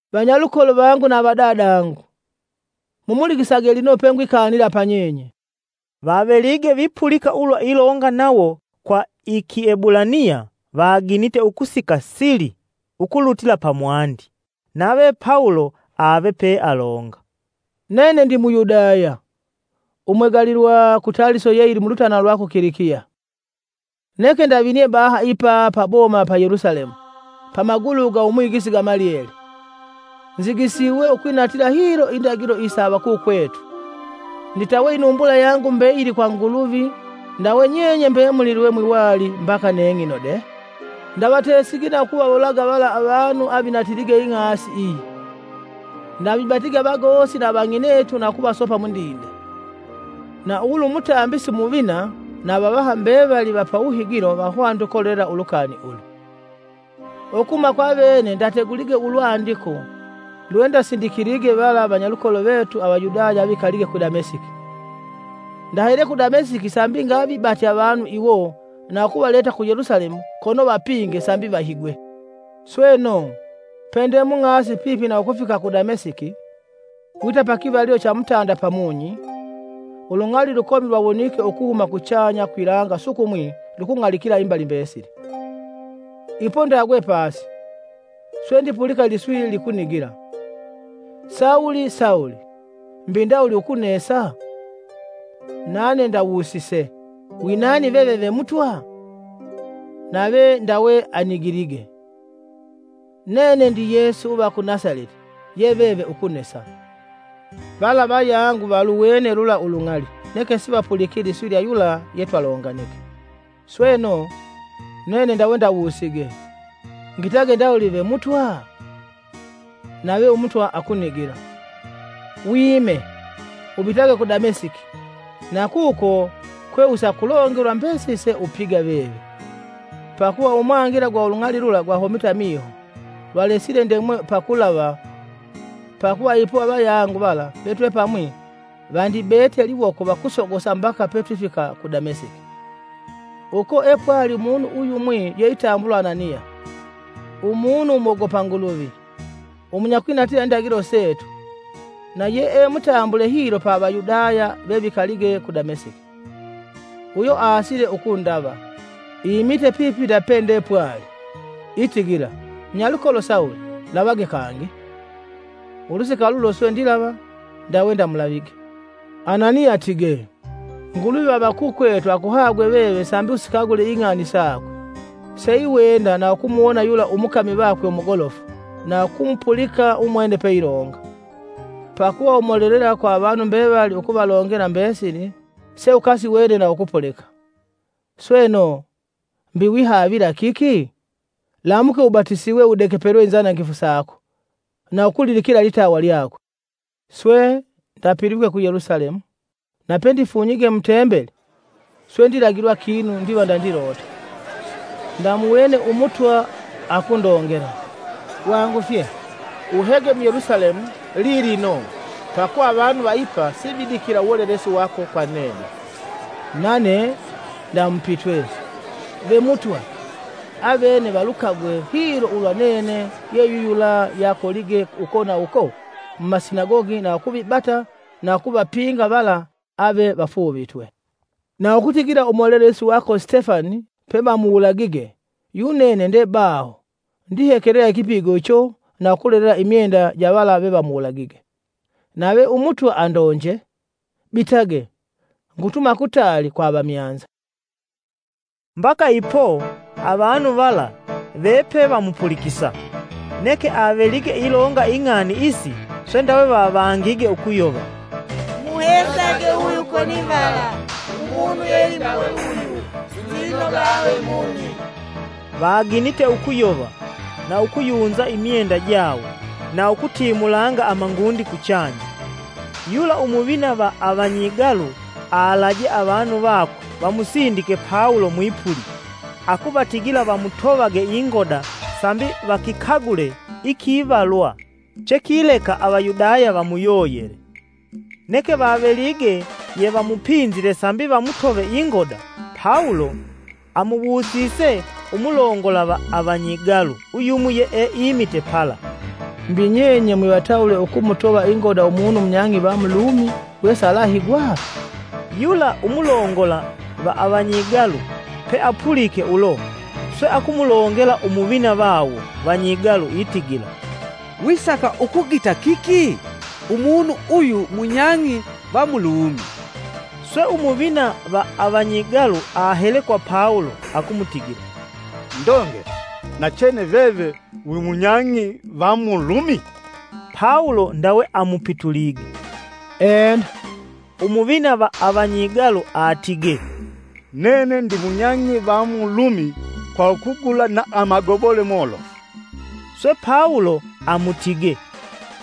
“Vanyalukolo vangu na avadadangu, mumulikisage lino pengwikanila panyenye!” Vavelige vipulika ulwa ilonga nawo kwa i Kiebulaniya vaginite ukusika sili ukulutila pamwandi. Nave Pawulo ave pealonga, “Nene ndi Muyudaya, umwegalilwa ku Taliso ye yili mulutanana lwa ku Kilikiya. Neke ndavinie baha ipa pa boma pa Yelusalemu pamagulu ga Umwigisi Gamalieli. Nzigisiwe ukwinatila hilo Indagilo isa avakukwetu. Nditawe inumbula yangu mbeyili kwa Nguluvi ndawe nyenye mbemuli lwe mwiwali mbaka neng'ino de. Ndavatesige na ukuvawulaga vala avanu avinatilige ing'asi iyi. Ndavibatige avagosi na avang'inetu na ukuvasopa mundinde. Na ulu Umutambisi Umuvina na avavaha mbevali va pawuhigilo vahwanite ukolelela ulukani ulu. Ukuhuma kwa avene ndategulige ulwandiko lwendasindikilige vala vanyalukolo vetu Avayudaya vevikalige ku Demasiki. Ndahele ku Damesiki sambi ngavibate avanu iwo na ukuvaleta ku Yelusalemu kono vapinge sambi vahigwe.” “Sweno, pende mung'asi pipi na ukufika ku Damesiki, wita pakivalilo cha mutanda pamunyi, ulung'ali lukomi lwawonike ukuhuma kuchanya kwilanga sukumwi lukung'alikila imbali mbesili. Ipo ndagwe pasi, swe ndipulika iliswi likunigila: ‘Sawulo, Sawulo! Mbi ndawuli ukunesa?’ Nane ndawusise: ‘Winani veve ve Mutwa?’ Nave ndawe anigilige: ‘Nene ndi Yesu uva ku Nasaleti ye veve ukunesa.’ Vala avayangu valuwene lula ulung'ali neke sivapuliki iliswi lya yula yetwalonganige. Sweno, nene ndawe ndawusige: ‘Ngitage ndawuli ve Mutwa?’ Nave Umutwa akunigila: ‘Wime, ubitage ku Damesiki na kuko kwe usakulongelwa mbesili se upiga veve.’ Pakuva umwangila gwa ulung'ali lula gwahomite amiho lwalesile ndemwe pakulava ipo avayangu vala vetwepamwi vandibete iliwoko vakusogosa mbaka petwifika ku Damesiki.” “Uko epwali umunu uyumwi yeitambulwa Ananiya, umunu umwogopa Nguluvi, umunyakwinatila indagilo setu na yee mutambule hilo pa Avayudaya vevikalige ku Damasiki. Uyo asile ukundava, imite pipi na pende pwali, itigila: ‘Munyalukolo Sawulo! Lavage kangi.’ Ulusika lulo swe ndilava, ndawe ndamulavige. Ananiya atigee, ‘Nguluvi va avakukwetu akuhagwe veve sambi usikagule ing'ani sakwe, seiwenda na ukumuwona yula umukami vakwe umugolofu na ukumupulika umwene peilonga. Pakuva umolelela kwa avanu mbevali ukuvalongela mbesili seukasiwene na ukupulika. Sweno, mbi wihavila kiki? Lamuke ubatisiwe udegepelwe inzanangifu sako na ukulidikila ilitawa lyakwe.’” “Swe, ndapilwike ku Yelusalemu, na pendifunyige mu Tembeli, swe ndilagilwa kinu ndiva ndandilota. Ndamuwene Umutwa akundongela: ‘Wangufye! Uhege mu Yelusalemu lilino pakuva avanu va ipa sividikila uwolelesi wako kwa nene.’ Nane ndamupitwe: ‘Ve Mutwa, avene valukagwe hilo ulwa nene yeyuyula yeakolige uko na uko mumasinagogi na ukuvibata na ukuvapinga vala ave vafuuvitwe. Na ukutigila umolelesi vako Sitefani pevamuwulagige, yunene ndebaho ndihekelela ikipigo icho na ukulolela imyenda ja vala vevamuwulagige.’ Nave Umutwa andonje: ‘Bitage, ngutuma kutali kwa avamyanza.’” Mbaka ipo, avanu vala vepevamupulikisa, neke avelige ilonga ing'ani isi, swe ndawe vavangige ukuyova, “Mumuhesage uyu konivala! Umunu yeindawe uyu silwinoga ave mumi.” Vaginite ukuyova na ukuyunza imyenda jawo na ukutimulanga amangundi kuchanya. Yula Umuvina va avanyigalu alaje avanu vakwe vamusindike Pawulo mwipuli, akuvatigila vamutovage ingoda sambi vakikagule ikivalwa chekileka avayudaya vamuyoyele. Neke vavelige yevamupinzile sambi vamutove ingoda, Pawulo amuwusise umulongola va avanyigalu uyumwi yeeimite pala, “Mbi nyenye mwivatawule ukumutova ingoda umunu munyang'i va mu Lumi wesalahigwa?” Yula umulongola va avanyigalu peapulike ulo, swe akumulongela Umuvina vawo vanyigalu itigila, “Wisaka ukugita kiki? Umunu uyu munyang'i va mu Lumi!” Swe, umuvina va avanyigalu ahele kwa Pawulo, akumutigila, “Ndongele, nachene veve, wimunyang'i va mu Lumi?” Pawulo ndawe amupitulige, “Ena” Umuvina va avanyigalu atigee, “Nene ndimunyang'i va mu Lumi kwa kugula amagobole molofu.” Swe Pawulo amutigee,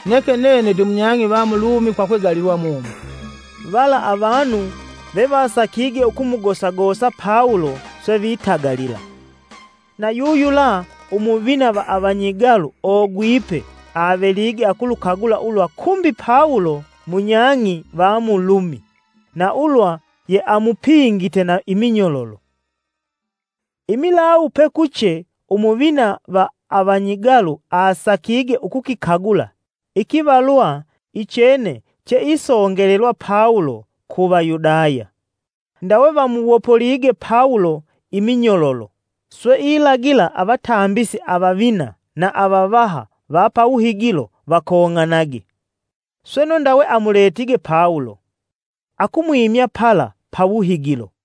“Neke nene ndimunyang'i va mu Lumi kwa kwegalilwa mumo.” Vala avanu vevasakige ukumugosagosa Pawulo swe vitagalila. Na yuyula umuvina va avanyigalu ogwipe avelige akulukagula ulwa kumbi Pawulo munyang'i va mu Lumi na ulwa yeamupingite na iminyololo. Imilawu pekuche, Umuvina va avanyigalu asakige ukukikagula ikivalwa ichene cheisongelelwa Pawulo ku Vayudaya. Ndawe vamuwopolige Pawulo iminyololo, swe ilagila avatambisi avavina na avavaha va pa wuhigilo vakong'anage. Sweno ndawe amuletige Pawulo, akumwimya pala pa wuhigilo.